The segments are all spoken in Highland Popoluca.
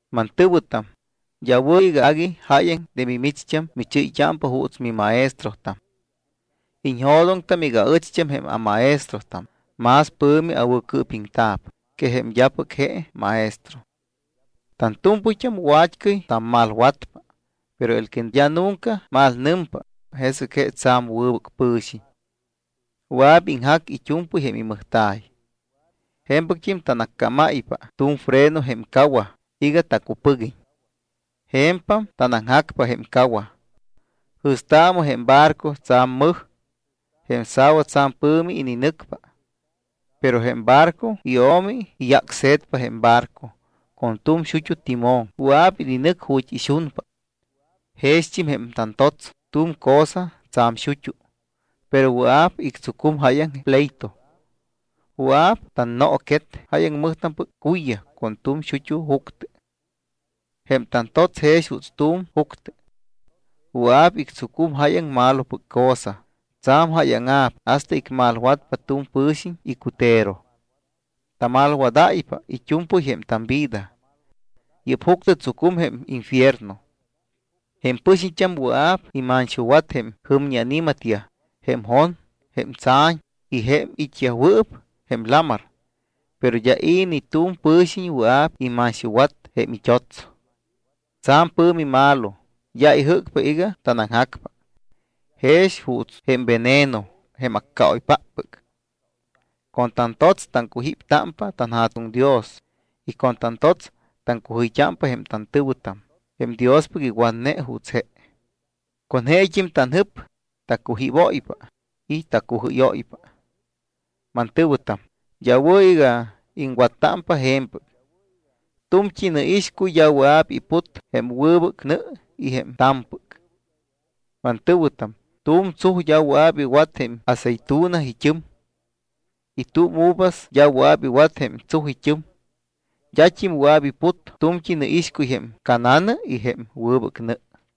Mantɨ̱wɨtam, d́a wɨ̱ iga agui jáyaŋ de micht́am michɨ́yt́ámpa juuts mimaestrotam. Iñjo̱doŋtam iga aɨcht́am jém amaestrotam más pɨ̱mi awɨ̱cɨɨpiŋta̱p que jém d́apɨc je maestro. Tantu̱mpɨyt́am wa̱t́cɨy tammalwatpa, pero él que d́a nunca malnɨmpa, jesɨc je tsa̱m wɨbɨc pɨ̱xiñ. Wɨa̱p iŋjac it́u̱mpɨy jém imɨjta̱y. Je̱mpɨct́im tanaccámáypa tu̱m freno jém cawaj iga tacupɨguiñ. Je̱mpam tanaŋjacpa jém cawaj. Jɨ̱staamɨ jém barco tsa̱m mɨj. Jém sa̱wa tsa̱m pɨ̱mi ininɨcpa. Pero jém barco io̱mi iyácse̱tpa jém barco, con tu̱m xut́u timón wɨa̱p ininɨc ju̱t́ ixunpa. Jext́im jém tantots tu̱m cosa tsa̱m xut́u, pero wɨa̱p ictsucum jáyaŋ pleito. Wɨa̱p tannooquet jáyaŋ mɨjtampɨc cuyyaj con tu̱m xut́u juctɨ. Jém tantots jex juuts tu̱m juctɨ. Wɨa̱p ictsucum jáyaŋ malopɨc cosa, tsa̱m jáyaŋa̱p hasta icmalwatpa tu̱m pɨ̱xiñ icutero. Tamalwadáypa it́u̱mpɨy jém tamvida. Yɨ́p juctɨ tsucum jém infierno. Jém pɨxiñt́am wɨa̱p imanxuwatyaj jém jɨmñi ani̱matyaj, jém jon, jém tsa̱ñ y jém it́yajwɨɨp jém lamar. Pero d́a i̱ ni tu̱m pɨ̱xiñ wɨa̱p imanxuwat jém it́ots. Tsa̱m pɨ̱mi malo, d́a ijɨ́cpa iga tanaŋjacpa. Jex juuts jém veneno jém accaoypáppɨc. Con tantots taŋcujíptámpa tanJa̱tuŋ Dios y con tantots taŋcujɨyt́ámpa jém tantɨ̱wɨtam jém Diospɨc iwatne juuts je. Con jeet́im tanjɨp tacujíbóypa y tacujɨ́yóypa. Mantɨ̱wɨtam, d́a wɨ̱ iga iŋwattámpa je̱mpɨc. Tu̱mt́i nɨixcuy d́a wɨa̱p iput jém wɨbɨc nɨ y jém ta̱mpɨc. Mantɨ̱wɨtam, tu̱m tsuj d́a wɨa̱p iwat jém aceitunas it́ɨm. Y tu̱m uvas d́a wɨa̱p iwat jém tsuj it́ɨm. D́at́im wɨa̱p iput tu̱mt́i nɨixcuy jém ca̱na̱nɨ y jém wɨbɨc nɨ.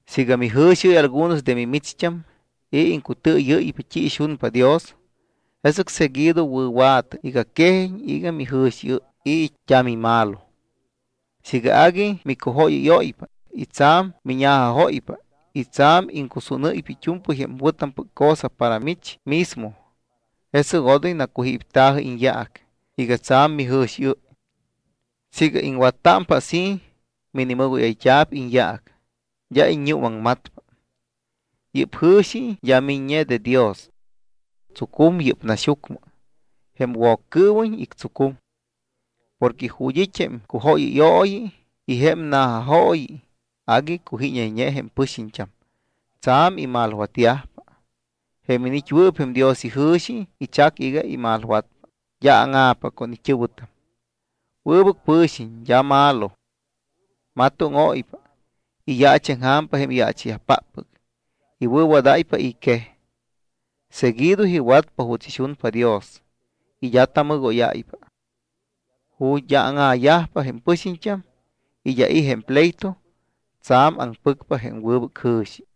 Siiga mijɨ̱xiɨ́y algunos de mimicht́am y iŋcutɨɨyɨ́ypa t́i ixunpa Dios, jesɨc seguido wɨ̱wa̱tɨ iga quejiñ iga mijɨ̱xiɨ́y y d́a mimalo. Siiga agui micujóyɨ́yóypa y tsa̱m miña̱jajóypa y tsa̱m iŋcusúnɨ́ypa it́u̱mpɨy jém wɨ̱tampɨc cosa para mich mismo, jesɨc odoy nacujípta̱jɨ iñyaac iga tsa̱m mijɨ̱xiɨ́y. Siiga iŋwattámpa así, minimɨgóyayt́a̱p iñyaac, d́a iññuumaŋmatpa. Yɨ́p jɨ̱xi d́a miññe de Dios. Tsucum yɨ́p naxyucmɨ, jém Woccɨɨwiñ ictsucum. Porque ju̱t́ it́ jém cujóyɨyooyi y jém na̱jajooyi, agui cujíñayñe jém pɨxiñt́am, tsa̱m imalwatyajpa. Jém iniit́wɨɨp jém Dios ijɨ̱xi ichacpa iga imalwatpa, d́a áŋa̱pa con it́ɨ̱wɨtam. Wɨbɨc pɨ̱xiñ, d́a malo. Matóŋóypa. Iyaachaŋja̱mpa jém yaacha̱yajpáppɨc, iwɨ̱wadáypa i̱ quej. Seguido iwatpa juuts ixunpa Dios y d́a tamɨgóyáypa. Ju̱t́ d́a áŋa̱yajpa jém pɨxiñt́am y d́a i̱ jém pleito, tsa̱m aŋpɨcpa jém wɨbɨc jɨ̱xi.